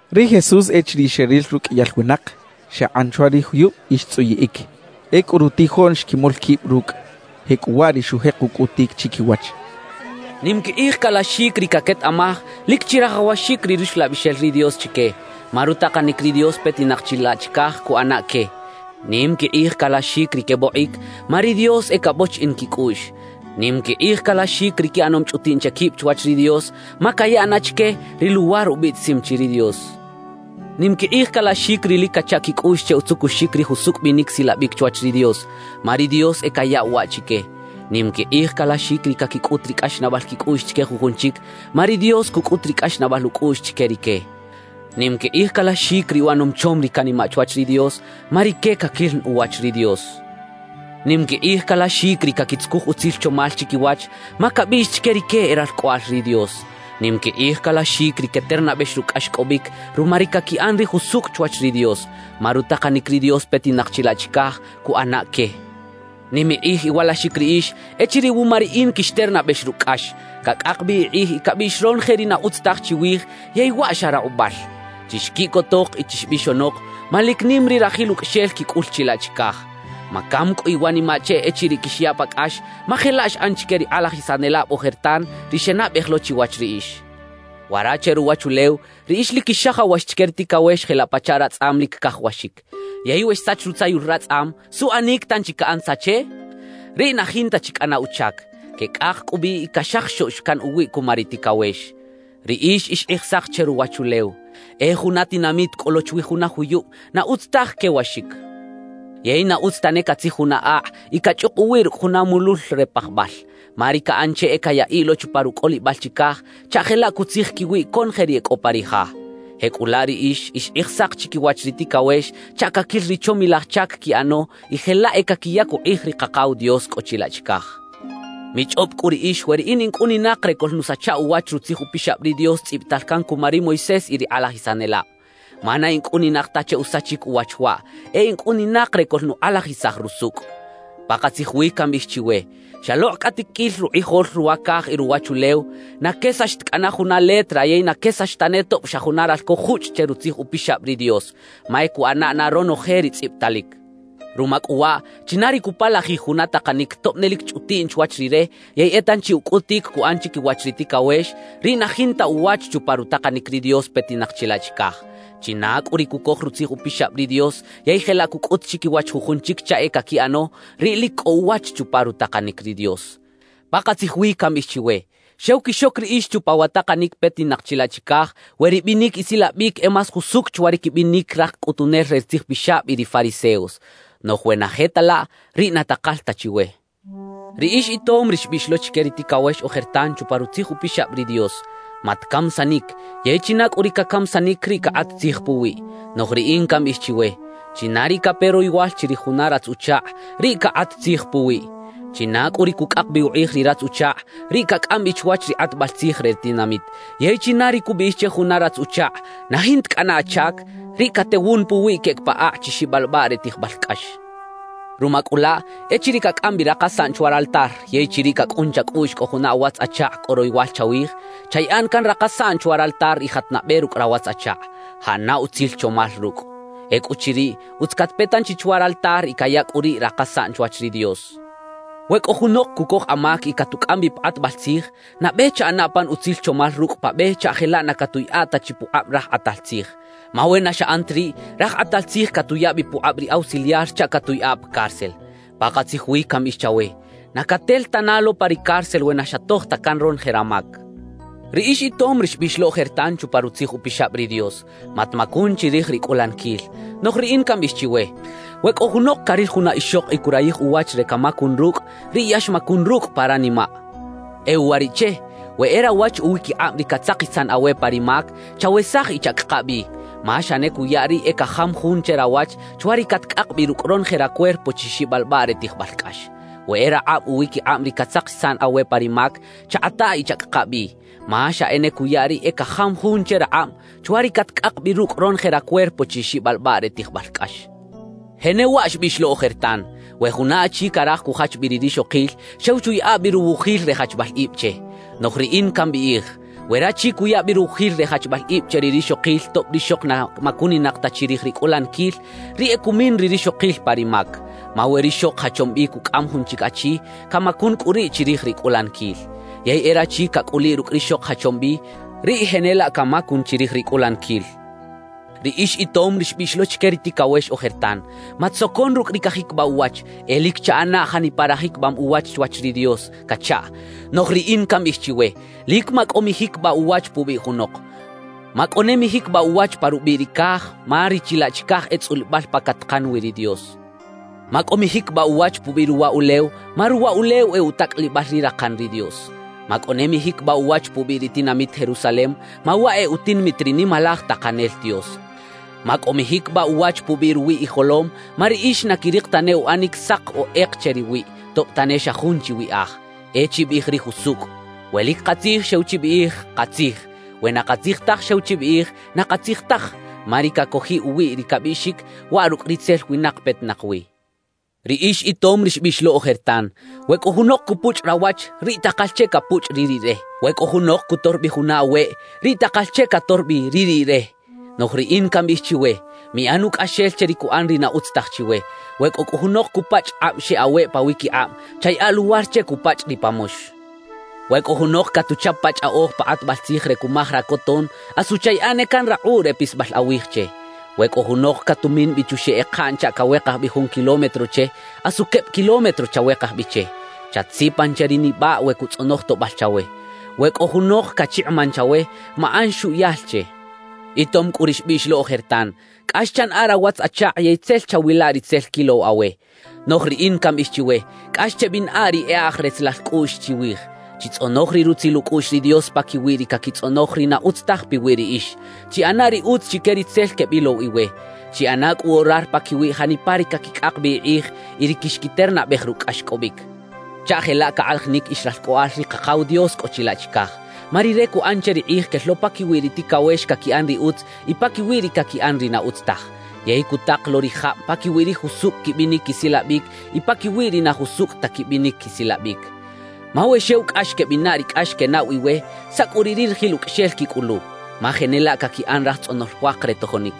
Ri Jesús, echiriꞌ xeril ruqꞌuiyal winak, xakꞌan chwa ri juyub y xtzꞌuyiꞌic. Ecꞌu rutijoꞌn xquimol quib rucꞌ. Jecꞌuwaꞌ ri xujek ucꞌutic chiquiwach: «Nim quikꞌij calaxic ri caquetaꞌmaj lic chirajawaxic ri Ruxlabixel ri Dios chique, ma rutakanic ri Dios petinak chilaꞌ chicaj cuꞌana que. Nim quikꞌij calaxic ri quebokꞌic, ma ri Dios e cabochiꞌin quicꞌuꞌx. Nim quikꞌij calaxic ri quiꞌanom chꞌutiꞌn che quib chwach ri Dios, ma cayaꞌ na chique, ri luwar ubiꞌtisim chi ri Dios. Nim quikꞌij calaxic ri lic cacha quicꞌuꞌx che utzukuxic ri jusucꞌ binic silabic chwach ri Dios, ma ri Dios e cayaꞌw waꞌ chique. Nim quikꞌij calaxic ri caquicꞌut ri cꞌaxnaꞌbal quicꞌuꞌx chique jujun chic, ma ri Dios cucꞌut ri cꞌaxnaꞌbal ucꞌuꞌx chique rique. Nim quikꞌij calaxic ri uꞌanom chom ri canimaꞌ chwach ri Dios, ma rique caquil na uwach ri Dios. Nim quikꞌij calaxic ri caquitzucuj utzil chomal chiquiwach, ma cabiꞌx chique rique e ralcꞌoꞌal ri Dios. Nim quikꞌij calaxic ri queternabex rucꞌ cꞌaxcꞌobic ruma ri caquiꞌan ri jusucꞌ chwach ri Dios, ma rutakanic ri Dios petinak chilaꞌ chicaj cuꞌana que. »Nim ikꞌij iwalaxic riꞌix echiriꞌ wuma riꞌin quixternabex rucꞌ cꞌax, cacꞌak bi ikꞌij y cabiꞌx ronoje ri na utz taj chiwij yey waꞌ xa rakꞌubal. Chixquiꞌcotok y chixbixonok, ma lic nim ri rajil ucꞌaxel quicꞌul chilaꞌ chicaj. Macam cꞌu iwanimaꞌ che echiriꞌ quixyaꞌ pa cꞌax, ma jelaꞌ xꞌan chique ri kꞌalajisanelab ojertan, ri xenabej lo chiwach riꞌix. »Wara che ruwachulew riꞌix lic quixajawax chique ri ticawex jelaꞌ pachaꞌ ratzꞌam lic cajawaxic. Yey we xsach rutzayul ratzꞌam, ¿suꞌanic tanchi caꞌan tza che? Riꞌ na jinta chi cꞌana uchac; queꞌcꞌak cꞌu bi y caxajaxoꞌx can uwiꞌ cuma ri ticawex. »Riꞌix ix kꞌijsak che ruwachulew. E juna tinamit cꞌo lo chwi juna juyub na utz taj quewaxic. Yey na utz tane catzij juna akꞌ y cachꞌuk uwiꞌ rucꞌ juna mulul re pajbal, ma ri caꞌan che e cayaꞌiꞌ lo chupa rucꞌolibal chicaj chaꞌ jelaꞌ cutzij quiwiꞌ conoje ri e cꞌo pa ri ja. Jecꞌulaꞌ riꞌix, ix kꞌijsak chiquiwach ri ticawex chaꞌ caquil ri chomilaj chac quiꞌano y jelaꞌ e caquiyac ukꞌij ri Kakaw Dios cꞌo chilaꞌ chicaj. »Michꞌob cꞌu riꞌix we riꞌin in cꞌuninak re coꞌlnusacha uwach Rutzij Upixab ri Dios tzꞌibital can cuma ri Moisés y ri kꞌalajisanelab. Ma na in cꞌuninak ta che usachic uwach waꞌ; e in cꞌuninak re coꞌlnukꞌalajisaj rusucꞌ. Pakatzij wi cambiꞌij chiwe: Xalokꞌ cꞌa tiquil rukꞌijol ruwa caj y ruwachulew, na quesax ta cꞌana juna letra yey na quesax tane tob xa juna ralco juchꞌ che Rutzij Upixab ri Dios, ma e cuꞌana na ronoje ri tzꞌibitalic. »Ruma cꞌu waꞌ, china ri cupalajij juna takanic tob ne lic chꞌutiꞌn chwach rire yey e tanchi ucꞌutic cuꞌan chiquiwach ri ticawex, riꞌ na jinta uwach chupa rutakanic ri Dios petinak chilaꞌ chicaj. China cꞌu ri cucoj Rutzij Upixab ri Dios yey jelaꞌ cucꞌut chiquiwach jujun chic chaꞌ e caquiꞌano, riꞌ lic cꞌo uwach chupa rutakanic ri Dios. »Pakatzij wi cambiꞌij chiwe: Xew quixoc riꞌix chupa wa takanic petinak chilaꞌ chicaj, we ribinic isilabic e más jusucꞌ chwa ri quibinic raj cꞌutunel re ri tzijpixab y ri fariseos. Noꞌj we na je ta laꞌ, riꞌ na takal ta chiwe. »Riꞌix itom ri xbiꞌx lo chique ri ticawex ojertan chupa Rutzij Upixab ri Dios: “Matcamisanic”; yey china cꞌu ri cacamisanic, riꞌ cakꞌat tzij puwiꞌ. »Noꞌj riꞌin cambiꞌij chiwe: China ri cape royowal chirij juna ratz-uchakꞌ, riꞌ cakꞌat tzij puwiꞌ. China cꞌu ri cucꞌak bi ukꞌij ri ratz-uchakꞌ, riꞌ cacꞌam bi chwach ri kꞌatbal tzij re ri tinamit. Yey china ri cubiꞌij che juna ratz-uchakꞌ: “¡Na jinta cꞌana achac!”, riꞌ catewun puwiꞌ queꞌec pa akꞌ chi xibalbaꞌ re tijbal cꞌax. »Ruma cꞌu laꞌ, echiriꞌ cacꞌam bi rakasaꞌn chwa raltar yey chiriꞌ cacꞌun chacꞌuꞌx cꞌo juna awatz-achakꞌ cꞌo royowal chawij, chayaꞌa na can rakasaꞌn chwa raltar y jat nabe rucꞌ rawatz-achakꞌ, jaꞌana utzil chomal rucꞌ. Ecꞌuchiriꞌ, utz catpe tanchi chwa raltar y caya cꞌu riꞌ rakasaꞌn chwach ri Dios. »We cꞌo junok cucoj amac y catucꞌam bi pa kꞌatbal tzij, nabe chaꞌana pan utzil chomal rucꞌ pa be chaꞌ jelaꞌ na catuꞌyaꞌa ta chi pukꞌab raj kꞌatal tzij. Ma we na xaꞌan ta riꞌ, raj kꞌatal tzij catuya bi pukꞌab ri ausiliar chaꞌ catuꞌyaꞌa pa cárcel. Pakatzij wi cambiꞌij chawe: Na catel tana lo pa ri cárcel we na xatoj ta can ronoje ramac. »Riꞌix itom ri xbiꞌx lo ojertan chupa Rutzij Upixab ri Dios: “Matmacun chirij ri cꞌulaniquil.” »Noꞌj riꞌin cambiꞌij chiwe: We cꞌo junok caril juna ixok y curayij uwach re camacun rucꞌ, riꞌ ya xmacun rucꞌ pa ranimaꞌ. »E uwariꞌche, we e rawach uwiquikꞌab ri catzakisan awe pa ri mac, chawesaj y chacꞌaka bi; ma xa ne cuya riꞌ e cajam jun che rawach, chwa ri catcꞌak bi rucꞌ ronoje racuerpo chi xibalbaꞌ re tijbal cꞌax. We e rakꞌab uwiquikꞌab ri catzakisan awe pa ri mac, chakꞌataꞌ y chacꞌaka bi; ma xa ne cuya riꞌ e cajam jun che rakꞌab, chwa ri catcꞌak bi rucꞌ ronoje racuerpo chi xibalbaꞌ re tijbal cꞌax. »Jenewaꞌ xbiꞌx lo ojertan: “We juna achi caraj cujach bi ri rixokil, xew chuyaꞌa bi ruwujil re jachbal ib che.” »Noꞌj riꞌin cambiꞌij: We rachi cuya bi ruwujil re jachbal ib che ri rixokil tob rixok na macuninak ta chirij ri cꞌulaniquil, riꞌ e cumin ri rixokil pa ri mac. Ma we rixok jachom bi cucꞌam jun chic achi, camacun cꞌu riꞌ chirij ri cꞌulaniquil. Yey e rachi cacꞌuliꞌ rucꞌ rixok jachom bi, riꞌ jenelaꞌ camacun chirij ri cꞌulaniquil. »Riꞌix itom ri xbiꞌx lo chique ri ticawex ojertan: “Matsocon rucꞌ ri cajiquibaꞌ uwach; e lic chaꞌana janipa rajiquibam uwach chwach ri Dios” cachaꞌ. »Noꞌj riꞌin cambiꞌij chiwe: Lic macꞌo mijiquibaꞌ uwach pubiꞌ junok. Macꞌo ne mijiquibaꞌ uwach pa rubiꞌ ri caj, ma ri chilaꞌ chicaj e tzꞌulibal pa catakan wi ri Dios. Macꞌo mijiquibaꞌ uwach pubiꞌ ruwa ulew, ma ruwa ulew e utacꞌalibal ri rakan ri Dios. Macꞌo ne mijiquibaꞌ uwach pubiꞌ ri tinamit Jerusalem, ma waꞌ e utinamit ri Nimalaj Takanel Dios. Macꞌo mijiquibaꞌ uwach pubiꞌ ruwiꞌ ijolom, ma riꞌix na quirik tane uꞌanic sak o kꞌek che riwiꞌ, tob tane xa jun chi wiꞌaj. E chibiꞌij ri jusucꞌ. We lic katzij, xew chibiꞌij: “Katzij.” We na katzij taj, xew chibiꞌij: “Na katzij taj.” Ma ri cacojiꞌ uwiꞌ ri cabiꞌxic, waꞌ rucꞌ ritzel winak petinak wi. »Riꞌix itom ri xbiꞌx lo ojertan: We cꞌo junok cupuchꞌ rawach, riꞌ takal che capuchꞌ ri riꞌre. We cꞌo junok cutor bi juna aweꞌ, riꞌ takal che cator bi ri riꞌre. »Noꞌj riꞌin cambiꞌij chiwe: Miꞌan ucꞌaxel che ri cuꞌan ri na utz taj chiwe. We cꞌo cꞌu junok cupachꞌ kꞌab xeꞌ aweꞌ pawiquikꞌab, chayaꞌa luwar che cupachꞌ ri pa mox. We cꞌo junok catuchap pa chꞌaꞌoj pa kꞌatbal tzij re cumaj racoton, asu chayaꞌa ne can rakꞌuꞌ re pisbal awij che. We cꞌo junok catumin bi chuxeꞌ ekaꞌn chaꞌ cawekaj bi jun kilómetro che, asu queb kilómetro chawekaj bi che. Chatsipan che ri nibaꞌ we cutzꞌonoj toꞌbal chawe. We cꞌo junok cachikꞌiman chawe, maꞌan xuꞌyal che. »Itom cꞌu ri xbiꞌx lo ojertan: Cꞌax chanaꞌa rawatz-achakꞌ yey tzel chawila ri tzel quilow awe. »Noꞌj riꞌin cambiꞌij chiwe: Cꞌax chebinaꞌa ri e aj retzelal cꞌuꞌx chiwij. Chitzꞌonoj ri rutzil ucꞌuꞌx ri Dios paquiwi ri caquitzꞌonoj ri na utz taj piwi riꞌix. Chiꞌana ri utz chique ri tzel quebilow iwe. Chiꞌana cꞌu orar paquiwi janipa ri caquicꞌak bi ikꞌij y ri quixquiternabej rucꞌ cꞌaxcꞌobic chaꞌ jelaꞌ cakꞌalajinic ix ralcꞌoꞌal ri Kakaw Dios cꞌo chilaꞌ chicaj. Ma Rire cuꞌan che ri kꞌij quel lo paquiwi ri ticawex caquiꞌan ri utz y paquiwi ri caquiꞌan ri na utz taj, yey cutak lo ri jab paquiwi ri jusucꞌ quibinic quisilabic y paquiwi ri na jusucꞌ ta quibinic quisilabic. »Ma we xew cꞌax quebinaꞌ ri cꞌax quenaꞌw iwe, ¿saꞌ cꞌu riꞌ ri rajil ucꞌaxel quicꞌulu? Ma jenelaꞌ caquiꞌan raj tzꞌonol puak re tojonic.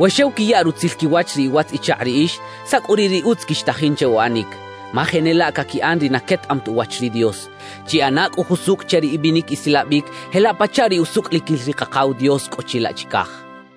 We xew quiya rutzil quiwach ri iwatz-ichakꞌ riꞌix, ¿saꞌ cꞌu riꞌ ri utz quixtajin che uꞌanic? Ma jenelaꞌ caquiꞌan ri na quetaꞌam ta uwach ri Dios. Chiꞌana cꞌu jusucꞌ che ri ibinic isilabic jelaꞌ pachaꞌ ri usucꞌliquil ri Kakaw Dios cꞌo chilaꞌ chicaj.